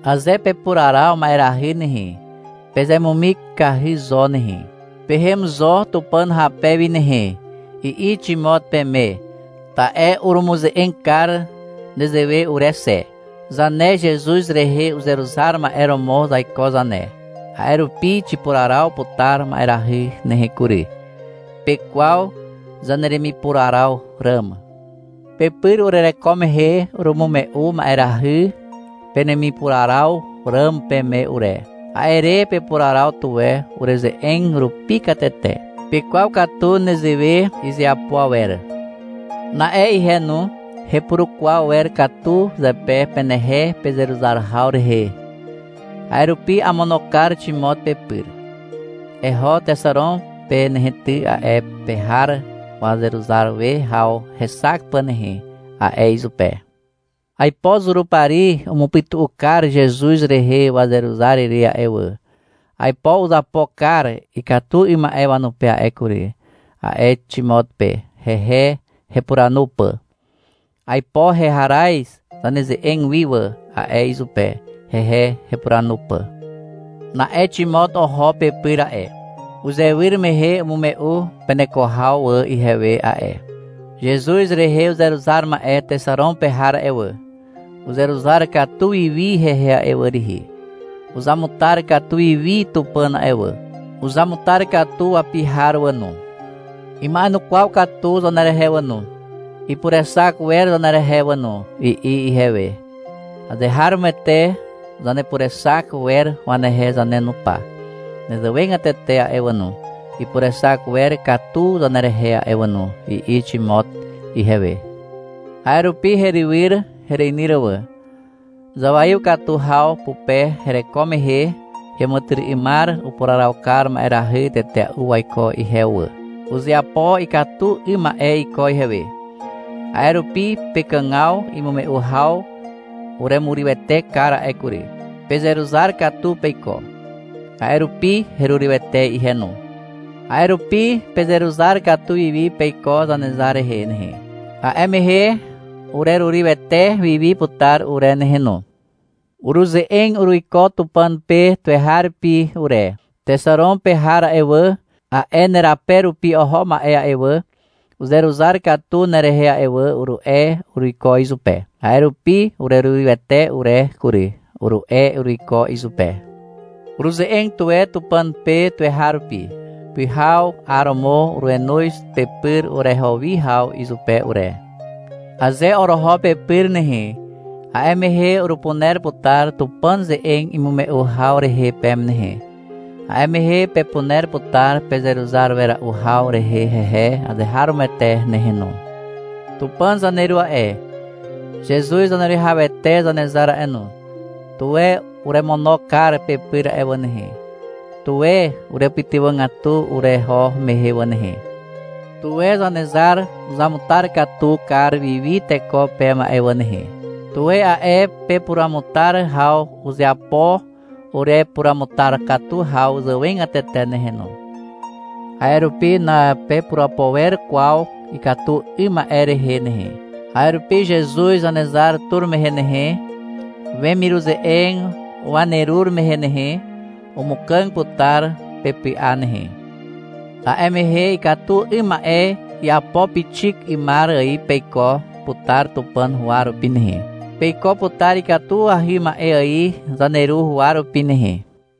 — Aze pepuraraw ma'erahy nehe, pezemumikahy zo nehe. Pehem zo Tupàn hape wi nehe, i'i Ximot peme, ta'e urumuze'eg kar nezewe ure xe. Zane Zezuz rehe uzeruzar ma'e romo zaiko zane. A'e rupi xipuraraw putar ma'erahy nehe kury. Pekwaw zaneremipuraraw ràm. Pepyr urereko mehe urumume'u ma'erahy penemipuraraw ràm peme ure. A'e re pepuraraw tuwe ureze'eg rupi katete. Pekwaw katu nezewe izeapo awer. Na'e ihe no, hepurukwaw wer katu zepe penehe, pezeruzar haw rehe. A'e rupi amono kar Ximot pepyr. — Eho Texaron pe nehe ty, a'e pe har wazeruzar we haw hexak pà nehe, a'e izupe. — Aipo Zurupari umupytu'u kar Zezuz rehe wazeruzar ire a'e wà. Aipo uzapo kar ikatu 'ym ma'e wanupe a'e kury, a'e Ximot pe, hehe hepuranu pà. — Aipo heharaz zaneze'eg wi wà, a'e izupe, hehe hepuranu pà. Na'e Ximot oho pepyr a'e. Uzewyr mehe umume'u peneko haw wà ihewe a'e. — Zezuz rehe uzeruzar ma'e Texaron pe har a'e wà, uzeruzar katu wiwi hehe a'e wà rihi. Uzamutar katu wiwi Tupàn a'e wà. Uzamutar katu wapi har wà no. Ima'enukwaw katu zanerehe wà no, ipurexak wer zanerehe wà no, i'i ihewe. -Azeharomoete zanepurexak wer wanehe zane no pa. Nezewegatete a'e wà no, ipurexak wer katu zanerehe a'e wà no, i'i Ximot ihewe. A'e rupi herywyr, hereinyr wà. Zawaiw katu haw pupe hereko mehe heàmàtyry'ymar upuraraw kar ma'erahy tetea'u waiko ihewe wà. Uzeapo ikatu 'ym ma'e iko ihewe. A'e rupi pekàgaw imume'u haw uremurywete kar a'e kury. Pezeruzar katu peiko. A'e rupi herurywete ihe no. A'e rupi pezeruzar katu wiwi peiko Zanezar rehe nehe, a'e mehe urerurywete wiwi putar ure nehe no. Uruze'eg uruiko Tupàn pe tuweharupi ure. — Texaron pe har a'e wà, a'e nerape rupi oho ma'e a'e wà, uzeruzar katu nerehe a'e wà, uru'e uruiko izupe. — A'e rupi urerurywete ure kury, uru'e uruiko izupe. Uruze'eg tuwe Tupàn pe tuweharupi. Pyhaw, 'aromo urenoz pepyr ureho wi haw izupe ure. Aze oroho pepyr nehe, a'e mehe urupuner putar Tupàn ze'eg imume'u haw rehe peme nehe. A'e mehe pepuner putar pezeruzar wera'u haw rehe hehe azeharomoete nehe no. Tupàn zaneru a'e, Zezuz Zaneruwihawete Zanezar a'e no, tuwe uremono kar pepyr a'e wà nehe. Tuwe urepytywàgatu ureho mehe wà nehe. Tuwe Zanezar uzamutar katu kar wiwi teko peme a'e wà nehe. Tuwe a'e pepuruamutar haw uzeapo urepuruamutar katu haw zàwegatete nehe no. A'e rupi napepurapo wer kwaw ikatu 'ym ma'e rehe nehe. A'e rupi Zezuz Zanezar tur mehe nehe, wemiruze'eg wanerur mehe nehe, umukàg putar pepy'a nehe. A'e mehe ikatu 'ym ma'e iapo pixik 'ymar ài peiko putar Tupàn huwa rupi nehe. Peiko putar ikatuahy ma'e ài zaneru huwa rupi nehe.